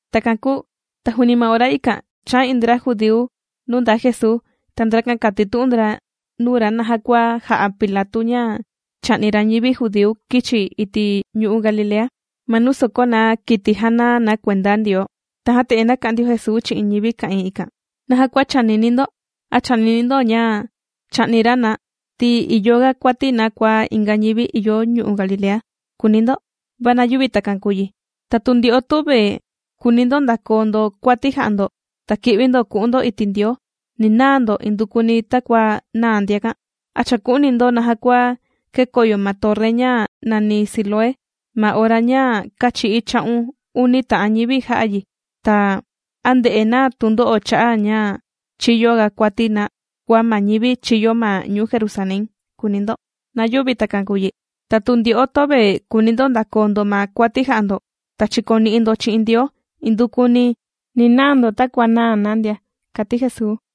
Takan kūu ta juuni ma ora ikan chāa iin ndra judíu nuu ndaa Jesuu. Ta ndrakan kātitu'un ndra nuu ra naja kua jā'a Pilatu ña chā'ni ra ñivi judíu kīchi iti' ñu'u' Galilea ma nuu sòkó na kiti jàna na kuenda Ndioo. Tajan te'en nāka'an ndio Jesuu chi'in ñivi ka'ìin ikan: ―¿Naja kua chànini ndo? ¿A chànini ndo ña chā'ni ra na ti ìyo ga kuati na kua inga ñivi ìyo ñu'u' Galilea?, kùuni ndo. Va na yüvi takan kùu yi. Ta tu ndyo'o töve kùuni ndo ndakoo ndo kuati jà'a ndo ta ki'vi ndo ku'un ndo iti' Ndioo, ni naa ndo indukuni takua nāa ndiakan. ¿A chàku'uni ndo naja kua kēkoyo ma torri ña nàni Siloé ma ora ña kāchi'í cha'un uni ta'an ñivi jā'a yi? Ta, ¿a ndē'e na tundo'o cha'a' ña chīyo ga kuati na kua ma ñivi chīyo ma ñuu Jerusalén?, kùuni ndo. Na yüvi takan kùu yi. Ta tu ndyo'o töve kùuni ndo ndakoo ndo ma kuati jà'a ndo ta chìkoni'i ndo chi'in Ndioo indukuni ni naa ndo takua nāa na ndia ―kàti Jesuu.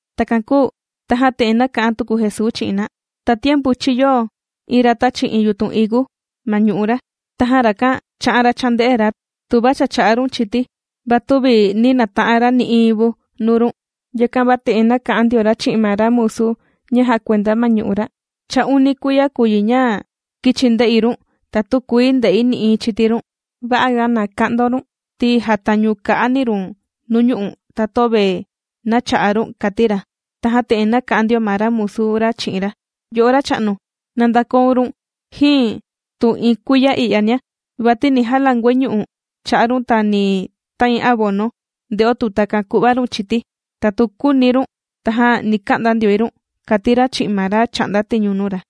Takan kūu tajan te'en nāka'an tuku Jesuu chi'in na: ―Tatiempu chīyo iin ra tāchi iin yutun higu ma ñu'u' ra. Tajan rakan chā'an ra chānde'e ra tuva cha chà'a run chiti, va tüvi nī nata'an ra nï'iin vu nuu run. Yakan va te'en nāka'an ndio ra chi'in ma ra musu ña jàkuenda ma ñu'u' ra: “Cha uni kuiya kùu yi ña kīchi̱ nde'i run ta tükuii nde'i nï'iin chiti run. Va'a ga na ka'ndaun run ti jàtañu ka'a ni run nuñu'u' ta töve na chà'a run”, kàti ra. Tajan te'en nāka'an ndio ma ra musu ra chi'in ra: “Yo'o racha'nu, na ndakoun run jin tu iin kuiya i'yania, vati ni jalanguai ñu'u' cha'a run ta ni tain abono, nde'o tu takan ku'va run chiti. Ta tu küuni run tajan ni ka'nda ndioi run”, kàti ra chi'in ma ra chà'nda tiñu nuu ra.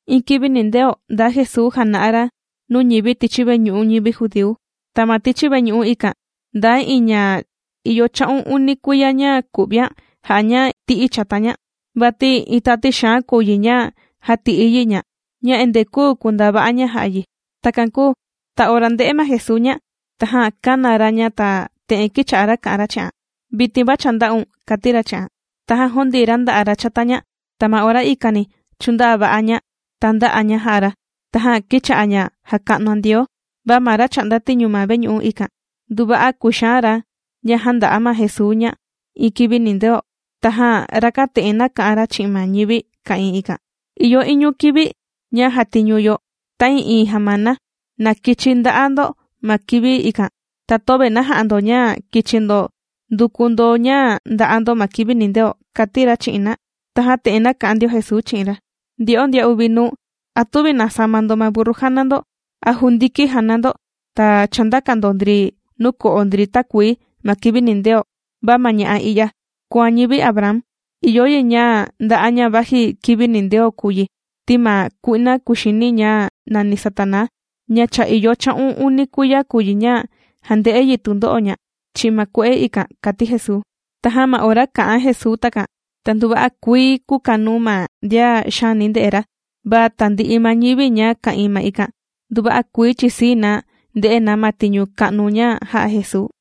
Iin kivi nindeo ndaa Jesuu jàna'a ra nuu ñivi tichi veñu'u ñivi judíu. Ta ma tichi veñu'u ikan ndaa iin ña cha ìyo cha'un uni kuiya ña ku'vian jà'a ña ti'i chata ña, vati iin tati xaan kùu yi ña jàti'i yi ña ña endee küu kundaa va'a ña jà'a yi. Takan kūu ta ora ndē'e ma Jesuu ña, tajan kāna ra ña ta te'en kīcha'a ra kà'an ra chi'an: ―Vitin va cha ndā'un ―kàti ra chi'an. Tajan jūndii ra nda'a' ra chata ña, ta ma ora ikani chūndaa va'a ña ta ndā'a ña jà'a ra, tajan kīcha'a ña jàka'nuan Ndioo. Va ma ra chà'nda tiñu ma veñu'u ikan, nduva'a kūxaan ra ña jānda'a ma Jesuu ña iin kivi nindeo. Tajan rakan te'en nāka'an ra chi'in ma ñivi ka'ìin ikan: ―Ìyo iñu kivi ña jàtiñu yo ta'ii'iin jamana, na kichi nda'a ndo ma kivi ikan, ta töve na ja'a ndo ña kichi ndo nduku ndo ña nda'a ndo ma kivi nindeo ―kàti ra chi'in na. Tajan te'en nāka'an ndio Jesuu chi'in ra: ―Ndyo'o ndian uvi nuu, ¿a tüvi nàsama ndo ma burru jàna ndo a jundiki jàna ndo ta chàndaka ndo ndri nuu ko'o ndri takuii ma kivi nindeo? Va ma ña'a i'ya kùan ñivi Abraham, ìyo yi ña nda'a ña vaji kivi nindeo kùu yi ti ma kui'na kuxini ña nàni Satanaa ña cha ìyo cha'un uni kuiya kùu yi ña jànde'e yi tundo'o ña chi'in ma kue'e ikan ―kàti Jesuu. Tajan ma ora kā'an Jesuu takan, ta nduva'a kuii kūkanuu ma ndian xaani ndè'e ra, va tandi'i ma ñivi ña ka'ìin ma ikan, nduva'a kuii chìsii na nde'e na ma tiñu ka'nu ña jà'a Jesuu.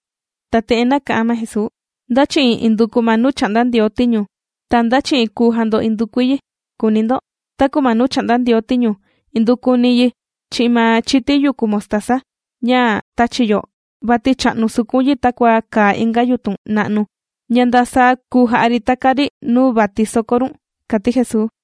Ta te'en nāka'an ma Jesuu: ―¿Nda chi'in induku ma nuu chà'nda Ndioo tiñu ta nda chi'in kùu jando indukui yi?, kùuni ndo. Taku ma nuu chà'nda Ndioo tiñu indukuni yi chi'in ma chiti yukú mostaza ña tàchi yo, vati chà'nu sukun yi takua kàa inga yutun na'nu ña nda saa kùu ja'a ri taka ri nuu vati soko run ―kàti Jesuu.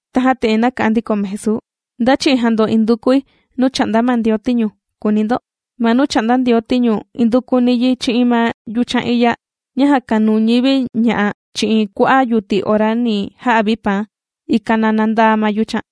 Tajan te'en nāka'an ndiko ma Jesuu: ―¿Nda chi'in jàndo indukui nuu chà'nda ma Ndioo tiñu?, kùuni ndo. Ma nuu chà'nda Ndioo tiñu indukuni yi chi'in ma yuchan iya ña jàkanuu ñivi ña'a chi'in kua'a' yuti ora ni ja'a vi paan, ikan na nandaa ma yuchan.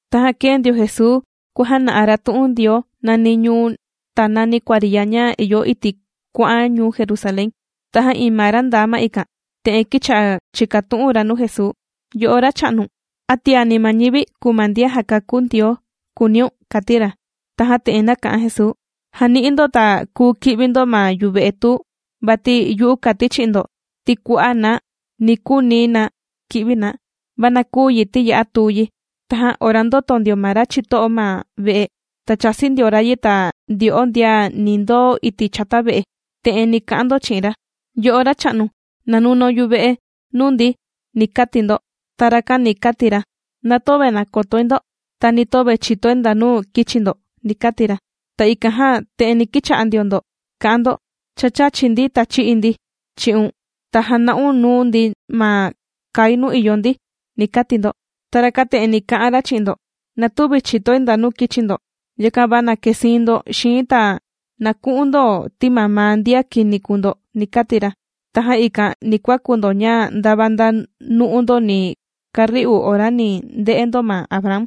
Tajan kēe ndio Jesuu kuàjana'a ra tu'un Ndioo nani ñuu ta nani kuariya ña ìyo iti' kuà'an ñuu Jerusalén. Tajan iin ma ra ndaa ma ikan te'en kīcha'a chìkatu'un ra nuu Jesuu: ―Yo'o Racha'nu, ¿a tiani ma ñivi kùu ma ndian jàkakú Ndioo?, kùuniun ―kàti ra. Tajan te'en nāka'an Jesuu: ―Jani'i ndo ta kùu ki'vi ndo ma yuve'e tuu, vati yu'u kàti chi'in ndo ti kua'a' na ni kuuni na ki'vi na, va na küu yi ti ya'a tuu yi. Tajan ora ndòto ndio ma ra chito'o ma ve'e ta chāsi ndio ra yi, ta ndyo'o ndian ni ndoo iti' chata ve'e, te'en ni ka'an ndo chi'in ra: “Yo'o racha'nu na nunaun yuve'e nuu ndi”, ni kati ndo. Ta rakan ni kati ra: “Na töve nàkotoi ndo ta ni töve chìtoi ndanu kīchi ndo”, ni kati ra. Ta ikan jan te'en ni kicha'a ndio ndo ka'an ndo: “Cha chāchi ndi ta chī'i ndi chi'un, ta jāna'un nuu ndi ma kai nuu ìyo ndi”, ni kati ndo. Ta rakan te'en ni naka'an ra chi'in ndo: “Na tüvi chìtoi ndanu kīchi ndo, yakan va na kesiin ndo xii̱n ta na ku'un ndo ti mamaa ndian kini kùu ndo”, ni kati ra. Tajan ikan ni kuaku ndo ña ndava nda nu'u ndo ni kari'u ora ni nde'e ndo ma Abraham,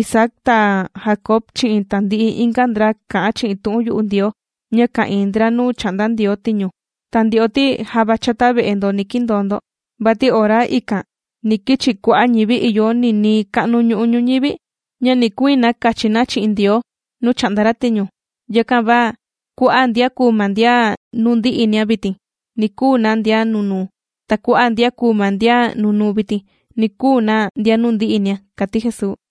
Isaac ta Jacob chi'in tandi'i inga ndra kà'an chi'in tu'un yu'u Ndioo ña ka'ìin ndra nuu chà'nda Ndioo tiñu. Ta ndyo'o ti java chata ve'e ni kindoo ndo. Vati ora ikan ni kichi kua'a' ñivi ìyo ninii ka'nu ñu'u ñuñivi, ña ni kuiin na kachi na chi'in Ndioo nuu chà'nda ra tiñu. Yakan va kua'a' ndian kùu ma ndian nuu ndi'inia vitin, ni kuu na ndian nunuu. Ta kua'a' ndian kùu ma ndian nunuu vitin, ni kuu na ndian nuu ndi'inia ―kàti Jesuu.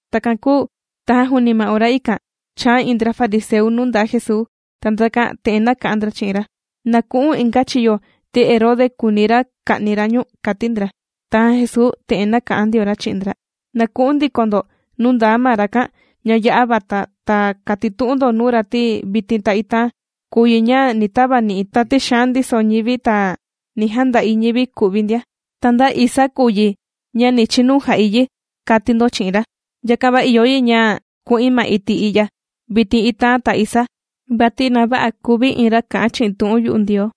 Takan kūu tajan juuni ma ora ikan, chāa iin ndra fariseu nuu ndaa Jesuu. Ta ndrakan te'en nāka'an ndra chi'in ra: ―Na ku'u̱n inga chiyo ti Herode kùuni ra ka'ni ra ñu̱n ―kàti ndra. Tajan Jesuu te'en nāka'an ndio ra chi'in ndra: ―Na ku'un ndiko ndo nuu ndaa ma rakan ña ya'a vata ta katitu'un ndo nuu ra, ti vitin ta itaan kùu yi ña ni tavani'i̱ tati xaan ndiso ñivi ta ni janda'i ñivi ku'vi ndia, ta nda isaa kùu yi ña ni chinu jà'i yi, kàti ndo chi'in ra. Yakan va ìyo yi ña ku'in ma iti' i'ya vitin, itaan ta isaa, vati na vä'a kuvi iin ra kà'an chi'in tu'un yu'u Ndioo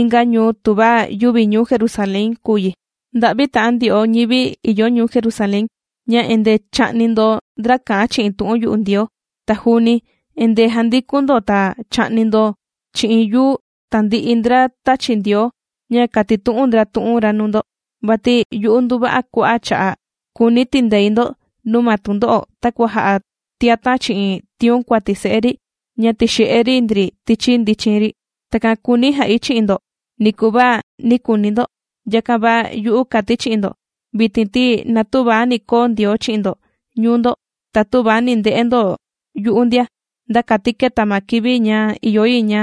inga ñuu tuva yüvi ñuu Jerusalén kùu yi. Nda'vi ta'an ndyo'o ñivi ìyo ñuu Jerusalén, ña endee chà'ni ndo ndra kà'an chi'in tu'un yu'u Ndioo, ta juuni endee jàndikun ndo ta chà'ni ndo chi'in yuu tandi'i ndra tāchi Ndioo ña kàtitu'un ndra tu'un ra nuu ndo. Vati yu'u nduva'a kua'a' cha'a' kūuni̱ tindei ndo nuu ma tundo'o takua jà'a tiatan' chi'in tiun kuati se'e ri ña tìxe'e ri ndri tichi ndichin ri. Takan kūuni̱ ja'i chi'in ndo niku va nī kuuni ndo. Yakan va yu'u kàti̱ chi'in ndo vitin ti na tüva ni koo Ndioo chi'in ndo ñuu ndo, ta tüva ni nde'e ndo yu'u ndia, nda kati keta ma kivi ña ìyo yi ña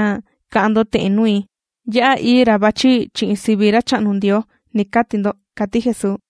ka'an ndo te'en nui: “Ya'a ií ra vàchi chi'in sivi Racha'nu Ndioo”, ni kati ndo ―kàti Jesuu.